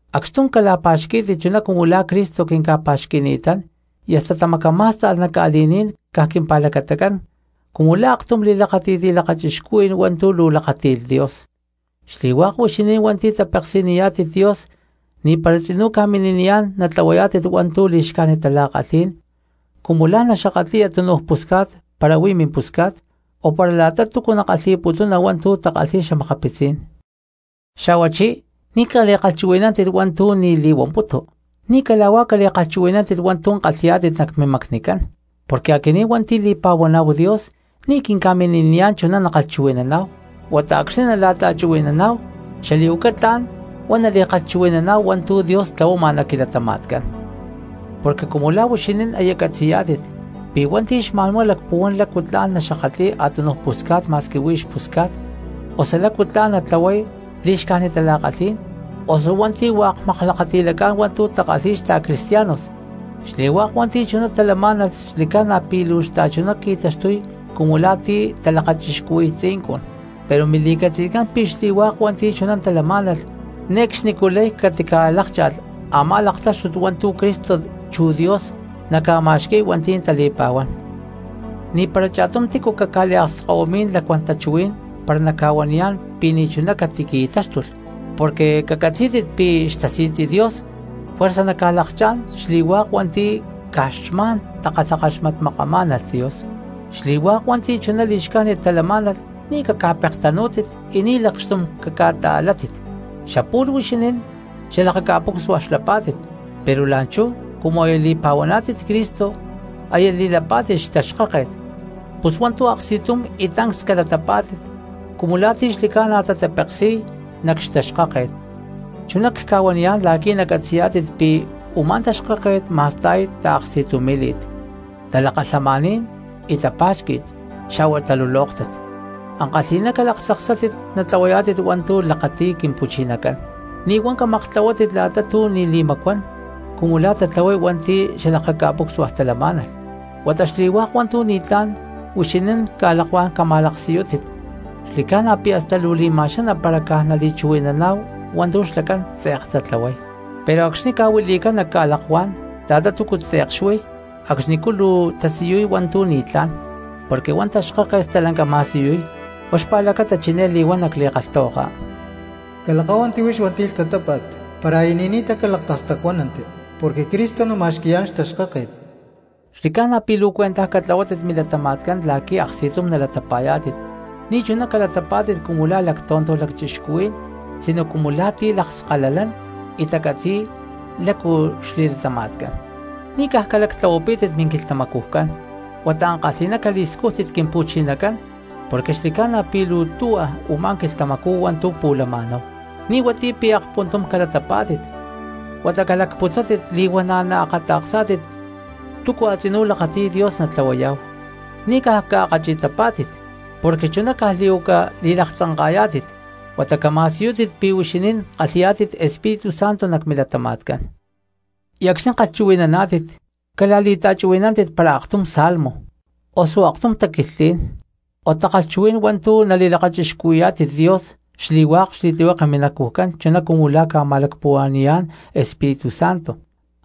Acxtum cala̠pa̠xquí̠tit chuná cumu la̠ Cristo quinca̠pa̠xqui̠ni̠tán y hasta tamacamá̠sta̠lh nac ca̠li̠ní̠n caj quimpa̠lacatacán cumu la̠ aktum xatamaakxtakajní̠n li̠lakachixcuhuí̠n hua̠ntu̠ luu lakáti̠lh Dios. Xli̠hua̠k huixinín hua̠nti̠ tapeksi̠niyá̠tit Dios ni̠para tzinú ca̠mini̠niyá̠n natlahuayá̠tit hua̠ntu̠ li̠xcájnit tala̠kalhí̠n, cumu la̠ naxakatli̠ya túnuj pusca̠t para huí mimpusca̠t, o para la̠ta túcu nakalhi̠putuna hua̠ntu̠ takalhi̠y xa̠makapitzí̠n. Xa̠huachí ni̠ cali̠kalhchuhui̠nántit hua̠ntu̠ ni̠ li̠huamputu, ni̠ cala̠huá cali̠kalhkama̠nántit hua̠ntu̠ kalhi̠yá̠tit nac mimacnicán, porque aquinín hua̠nti̠ li̠pa̠huaná̠hu Dios ni̠ quinca̠mini̠niyá̠n chuná nakalhchuhui̠naná̠hu, huata acxni̠ nala̠ta̠chuhui̠naná̠hu xali̠huaca tla̠n huá nali̠kalhchuhui̠naná̠hu hua̠ntu̠ Dios tlahuama nac quilatama̠tcán. Porque cumu la̠ huixinín aya catzi̠yá̠tit pi̠ hua̠nti̠ xma̠nhuá lacpuhuán lácu tla̠n naxakatli̠y a̠túnuj pusca̠t ma̠squi huí xpusca̠tcán, osu lácu tla̠n natatlahuay li̠xcájnit tala̠kalhí̠n, osu hua̠nti̠ hua̠k maklakati̠lacá̠n hua̠ntu̠ takalhi̠y xta̠cristianos (xli̠hua̠k hua̠nti̠ chuná talamá̠nalh xli̠ca̠na pi̠ luu xta̠chuná qui̠taxtuy cumu la̠ ti̠ talakachixcuhui̠y tzincun), pero mili̠catzi̠tcán pi̠ xli̠hua̠k hua̠nti̠ chuná talamá̠nalh ne̠cxnicú lay catica̠lákcha̠lh a̠má laktáxtut hua̠ntu̠ Cristo chu Dios naca̠ma̠xqui̠y hua̠nti̠ tali̠pa̠huán. Ni̠para cha̠tum tícu caca̠liakskahuimí̠n lacuán tachuhuí̠n para naca̠huaniyán pi̠ ni̠chuná catiqui̠táxtulh, porque cacatzí̠tit pi̠ xtasi̠tzi Dios juerza naca̠lakchá̠n xli̠hua̠k hua̠nti̠ caj xma̠n takalhakaxmatmakamá̠nalh Dios. Xli̠hua̠k hua̠nti̠ chuná li̠xcájnit talamá̠nalh ni̠ caca̠pektanú̠tit y ni̠ lacxtum caca̠ta̠látit. Xapu̠lh huixinín xalakaca̠pucsua xlapá̠tit, pero la̠nchú cumu aya li̠pa̠huaná̠tit Cristo aya li̠lapá̠tit xtaxkáket; pus hua̠ntu̠ aksti̠tum y tancs calatapá̠tit cumu la̠ ti̠ xli̠ca̠na tatapeksi̠y nac xtaxkáket. Chuná cca̠huaniyá̠n la̠qui̠ nacatzi̠yá̠tit pi̠ u̠má taxkáket ma̠sta̠y taaksti̠tumí̠li̠t, talakalhamaní̠n y tapa̠xqui̠t xa̠hua talulóktat. Ankalhi̠ná calaktzaksátit natlahuayá̠tit hua̠ntu̠ lakati̠y Quimpu̠chinacán. Ni̠ huá camaktlahuátit la̠ta tu̠ ni̠ li̠macuán cumu la̠ tatlahuay hua̠nti̠ xalakaca̠pucsua talamá̠nalh, huata xli̠hua̠k hua̠ntu̠ ni̠tlá̠n huixinín ca̠lakuá̠n cama̠laksiyútit. Xli̠ca̠na pi̠ hasta luu li̠ma̠xaná para caj nali̠chuhui̠naná̠hu hua̠ntu̠ xlacán tze̠k tatlahuay; pero acxni̠ ca̠huili̠cán nac ca̠lakuá̠n la̠ta túcu tze̠k xuí acxnicú chú luu tasiyuy hua̠ntu̠ ni̠tlá̠n, porque huá xtaxkáket stalanca ma̠siyuy. Huá xpa̠lacata chiné li̠huán nac li̠kalhtahuaka: Calakáhuanti huix hua̠nti̠ lhtatápa̠t; para aya ni̠ni̠ta, calacastacuánanti, porque Cristo nama̠xqui̠yá̠n xtaxkáket. Xli̠ca̠na pi̠ luu cuentaj catlahuátit milatama̠tcán la̠qui̠ aksti̠tum nalatapa̠yá̠tit. Ni̠chuná calatapá̠tit cumu la̠ lactonto lacchixcuhuí̠n sino cumu la̠ ti̠ lakskalalán y tacatzi̠y lácu xli̠latama̠tcán. Ni̠ caj calactlahuapítit minquilhtamacujcán, huata ankalhi̠ná cali̠scújtit Quimpu̠chinacán porque xli̠ca̠na pi̠ luu tuhua u̠má quilhtamacú hua̠ntu̠ pu̠lama̠náhu. Ni̠ huatiyá pi̠ akpuntum calatapá̠tit huata calacputzátit li̠huana̠ naakata̠ksá̠tit túcu a̠tzinú lakati̠y Dios natlahuayá̠hu. Ni̠ caj caakkachi̠tapá̠tit porque chuná caj li̠huaca li̠laktzanka̠ta̠yayá̠tit, huata cama̠siyútit pi̠ huixinín kalhi̠yá̠tit Espíritu Santo nac milatama̠tcán. Y acxni̠ kalhchuhui̠naná̠tit cala̠li̠ta̠chuhui̠nántit para aktum salmo, osu aktum taquilhtlí̠n o takalhchuhuí̠n hua̠ntu̠ nali̠lakachixcuhui̠yá̠tit Dios xli̠hua̠k xli̠tlihueke minacujcán chuná cumu la̠ ca̠ma̠lacpuhua̠ni̠yá̠n Espíritu Santo.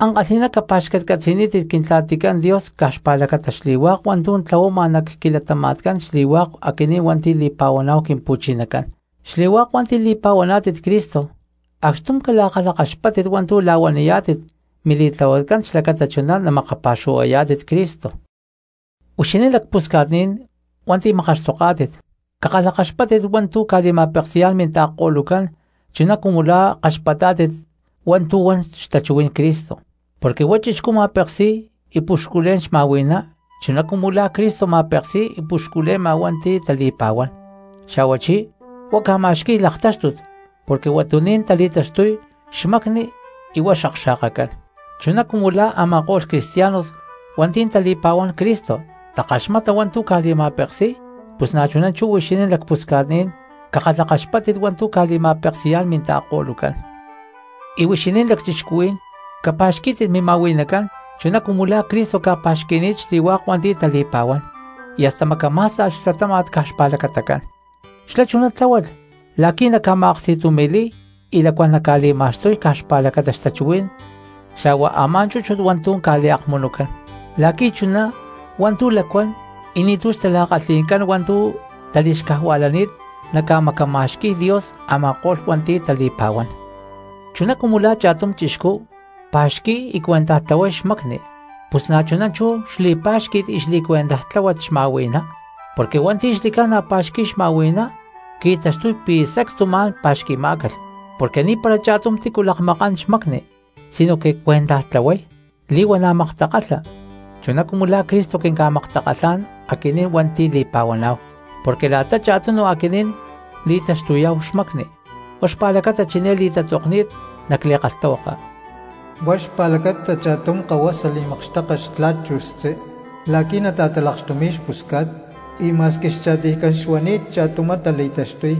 Ankalhi̠ná capa̠xcatcatzi̠nítit Quintla̠ticán Dios caj xpa̠lacata xli̠hua̠k hua̠ntu̠ tlahuama nac quilatama̠tcán xli̠hua̠k aquinín hua̠nti̠ li̠pa̠huaná̠hu Quimpu̠chinacán. Xli̠hua̠k hua̠nti̠ li̠pa̠huaná̠tit Cristo acxtum cala̠kalhakaxpátit hua̠ntu̠ la̠huaniyá̠tit mili̠tlahuatcán xlacata chuná namakapa̠xuhuayá̠tit Cristo. Huixinín lacpusca̠tní̠n hua̠nti̠ makaxtoká̠tit, cakalhakaxpáttit hua̠ntu̠ ca̠li̠ma̠peksi̠yá̠n minta̠ko̠lucán chuná cumu la̠ kaxpatá̠tit hua̠ntu̠ huan xtachuhuí̠n Cristo. Porque huá chixcú ma̠peksi̠y y puxculé̠n xma̠hui̠ná chuná cumu la̠ Cristo ma̠peksi̠y y ca̠puxcule̠ma hua̠nti̠ tali̠pa̠huán, xa̠huachí huá ca̠ma̠xqui̠y laktáxtut porque huatuní̠n tali̠taxtuy xmacni y huá xakxa̠kacán. Chuná cumu la̠ a̠ma̠ko̠lh cristianos hua̠nti̠ tali̠pa̠huán Cristo takaxmata hua̠ntu̠ ca̠li̠ma̠peksi̠y pus na̠chuná chú huixinín lacpusca̠tní̠n cakalhakaxpáttit hua̠ntu̠ ca̠li̠ma̠peksi̠yá̠n minta̠ko̠lucán. Y huixinín lacchixcuhuí̠n capa̠xquí̠tit mima̠hui̠nacán chuná cumu la̠ Cristo ca̠pa̠xqui̠ni̠t xli̠hua̠k hua̠nti̠ tali̠pa̠huán, y hasta macamá̠sta̠lh xlatáma̠t caj xpa̠lacatacán. Xlá chuná tláhualh la̠qui̠ naca̠ma̠aksti̠tumi̠li̠y y lacuán naca̠li̠ma̠xtuy caj xpa̠lacata xtachuhuí̠n xa̠huá a̠má chúchut hua̠ntu̠ ca̠liakmunucán, la̠qui̠ chuná hua̠ntu̠ lacuán y ni̠tu̠ xtala̠kalhi̠ncán hua̠ntu̠ tali̠xcajua̠lani̠t namacama̠xqui̠y Dios a̠ma̠ko̠lh hua̠nti̠ tali̠pa̠huán. Chuná cumu la̠ cha̠tum chixcú pa̠xqui̠y y cuentaj tlahuay xmacni, pus na̠chuná xli̠pá̠xqui̠t y xli̠cuentajtláhuat xma̠hui̠ná. Porque hua̠nti̠ xli̠ca̠na pa̠xqui̠y xma̠hui̠ná qui̠taxtuy pi̠ sacstu ma̠n pa̠xqui̠má̠calh. Porque ni̠para cha̠tum tícu lakmakán xmacni sinoque cuentaj tlahuay y li̠huana̠ maktakalha, chuná cumu la̠ Cristo quinca̠maktakalhá̠n aquinín hua̠nti̠ li̠pa̠huaná̠hu, porque la̠ta cha̠tunu aquinín li̠taxtuyá̠hu xmacni. Huá xpa̠lacata chiné li̠tatzoktahuilani̠t nac li̠kalhtahuaka: “Huá xpa̠lacata cha̠tum kahuasa li̠makxteka xtla̠t chu xtzí la̠qui̠ nata̠talakxtumi̠y xpusca̠t, y ma̠squi xcha̠tiycán xuani̠t cha̠tumá tali̠taxtuy.”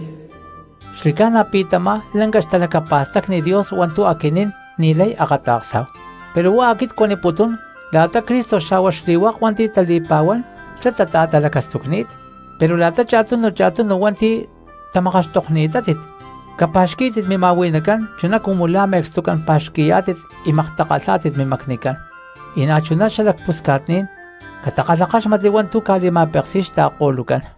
Xli̠ca̠na pi̠ tamá lanca xtalacapa̠stacni Dios hua̠ntu̠ aquinín ni̠lay akata̠ksá̠hu, pero huá aquit cuaniputún la̠ta Cristo xa̠hua xli̠hua̠k hua̠nti̠ tali̠pa̠huán xlá tata̠talacastucni̠t. Pero la̠ta cha̠tunu cha̠tunu hua̠nti̠ tamakaxtokni̠tátit capa̠xquí̠tit mima̠hui̠nacán chuná cumu la̠ me̠cstucán pa̠xqui̠yá̠tit y maktakalhá̠tit mimacnicán, y na̠chuná xalacpusca̠tní̠n catakalhakáxmatli hua̠ntu̠ ca̠li̠ma̠peksi̠y xta̠ko̠lucán.